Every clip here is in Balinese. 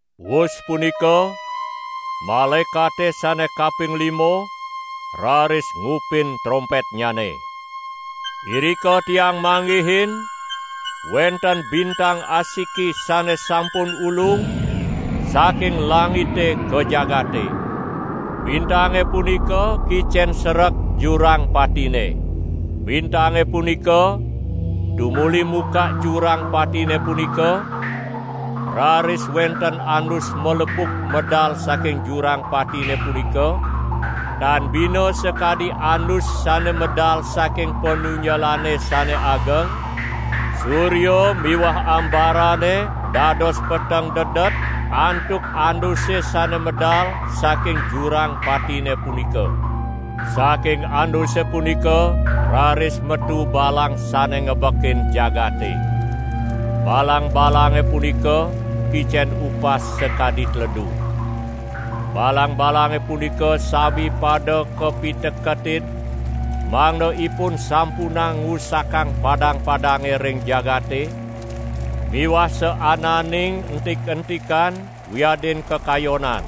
Wus punika malaekate sane kaping lima raris ngupin trompetnyane. Irika tiang manggihin wenten bintang asiki sane sampun ulung saking langite ka jagate. Bintange punika kicen sereg jurang patine. Bintange punika tumuli mukak jurang patine punika, raris wenten andus malepuk medal saking jurang patine punika, tan bina sakadi andus sane medal saking panunjelane sane ageng; surya miwah ambarane dados peteng dedet antuk anduse sane medal saking jurang patine punika. Saking anduse punika raris metu balang sane ngebekin jagate. Balang-balange punika kicen upas sakadi teledu. Balang-balange punika sami pada kapiteketin mangda ipun sampunang ngusakang padang-padange ring jagate miwah saananing entik-entikan wiadin kekayonan.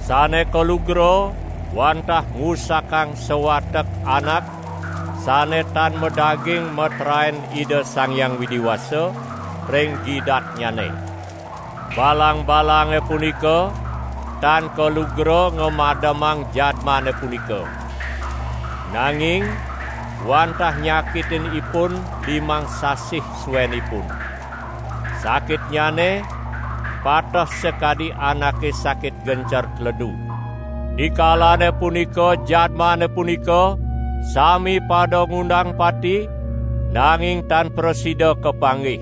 Sane kalugra wantah ngusakang sawatek anak sane tan madaging meteraen Ida Sang Hyang Widi Wasa ring gidatnyane. Balang-balange punika tan kalugra ngamademang jadmane punika. Nanging wantah nyakitin ipun limang sasih suenipun. Sakitnyane pateh sakadi anake sakit gencer teledu. Dikalane punika jadmane punika sami pada ngundang pati, nanging tan prasida kapanggih.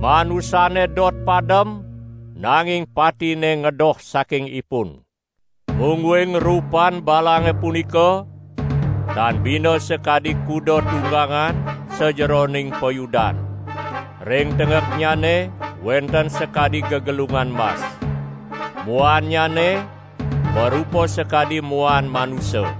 Manusane dot padem, nanging patine ngedoh saking ipun. Mungguing rupan balange punika tan bina sakadi kuda tunggangan sajeroning payudan. Ring tenggeknyane wenten sakadi gegelungan mas. Muannyane marupa sakadi muan manusa.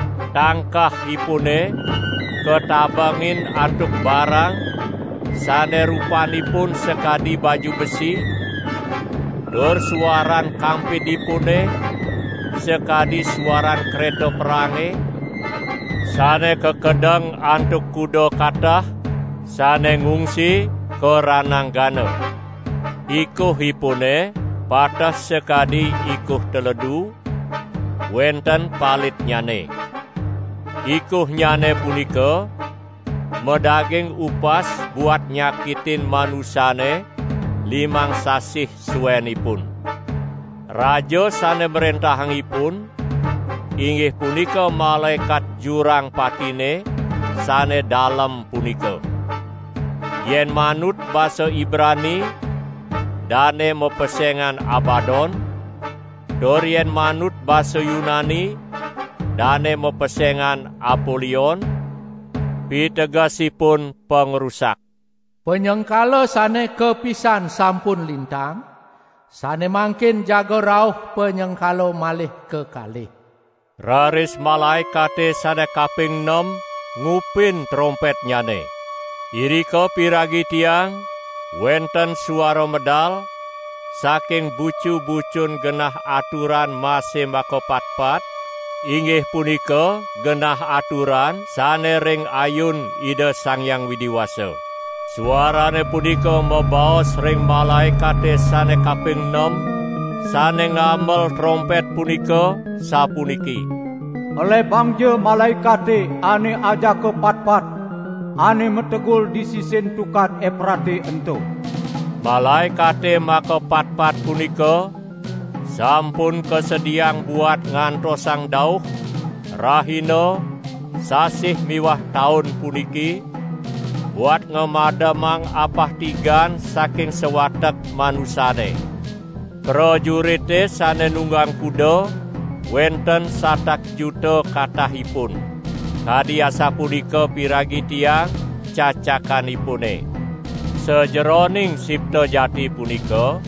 Tangkahipune katabengin antuk barang sane rupanipun sakadi baju besi, tur suaran kampidipune sakadi suaran kreta perange, sane kakedeng antuk kuda katah, sane ngungsi ka rananggana. Ikuhipune pateh sakadi ikuh teledu, wenten palitnyane. Ikuhnyane punika madaging upas buat nyakitin manusane limang sasih suenipun. Raja sane mrentahang ipun, inggih punika malaekat jurang patine sane dalem punika. Yen manut basa Ibrani dane mapesengan Abadon, tur yen manut basa Yunani dane mapesengan Apolion (pitegesipun pangrusak). Panyengkala sane kapisan sampun lintang, sane mangkin jaga rauh panyengkala malih kekalih. Raris malaekate sane kaping nem ngupin trompetnyane. Irika piragi tiang wenten suara medal saking bucu-bucun genah aturan mase makapatpat, inggih punika genah aturan sane ring ayun Ida Sang Hyang Widi Wasa. Suarane punika mabaos ring malaekate sane kaping nem sane ngamel trompet punika, sapuniki: "Elebangja malaekate ane ajaka patpat ane mategul di sisin Tukad Eprate ento." Malaekate makapatpat punika sampun kasediaang buat ngantosang dauh, rahina, sasih miwah taun puniki, buat ngamademang apah tigan saking sawatek manusane. Prajurite sane nunggang kuda wenten satak juta katahipun. Kadi asapunika piragi tiang cacakanipune. Sajeroning sipta jati punika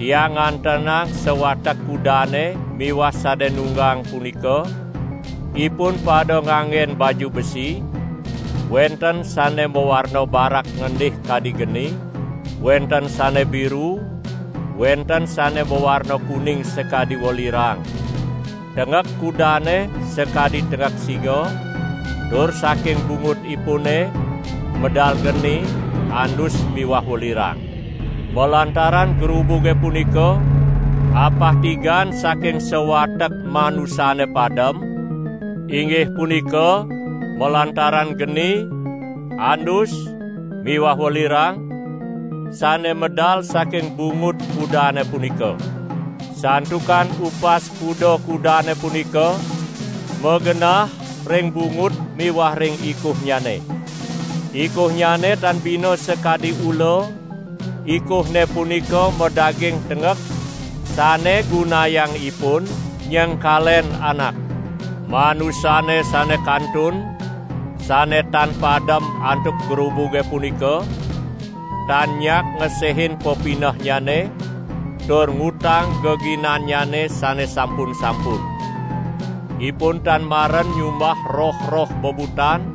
tiang ngantenang sawatek kudane miwah sane nunggang punika, ipun pada nganggen baju besi, wenten sane mawarna barak ngendih kadi geni, wenten sane biru, wenten sane mawarna kuning sakadi welirang. Tenggek kudane sakadi tenggek singa tur saking bungutipune medal geni, andus miwah welirang. Malantaran grubuge puniki, apah tigan saking sawatek manusane padem, inggih punika malantaran geni, andus miwah welirang, sane medal saking bungut kudane punika. Santukan upas kuda-kudane punika magenah ring bungut miwah ring ikuhnyane. Ikuhnyane tan bina sakadi ula; ikuhne punika madaging tenggek, sane gunayang ipun nyengkalen anak. Manusane sane kantun, sane tan padem antuk grubuge punika, tan nyak ngesehin pepinehnyane tur ngutang geginannyane sane sampun-sampun. Ipun tan maren nyumbah roh-roh bebutan,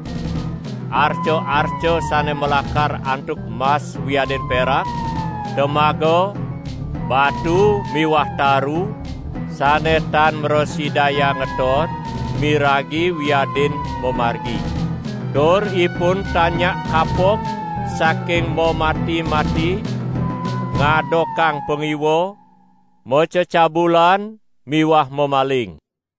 arca-arca sane malakar antuk mas wiadin perak, temaga, batu miwah taru sane tan mrasidayang ngeton, miragi wiadin mamargi. Tur ipun tan nyak kapok saking mamati-mati, ngadokang pangiwa, macecabulan miwah mamaling.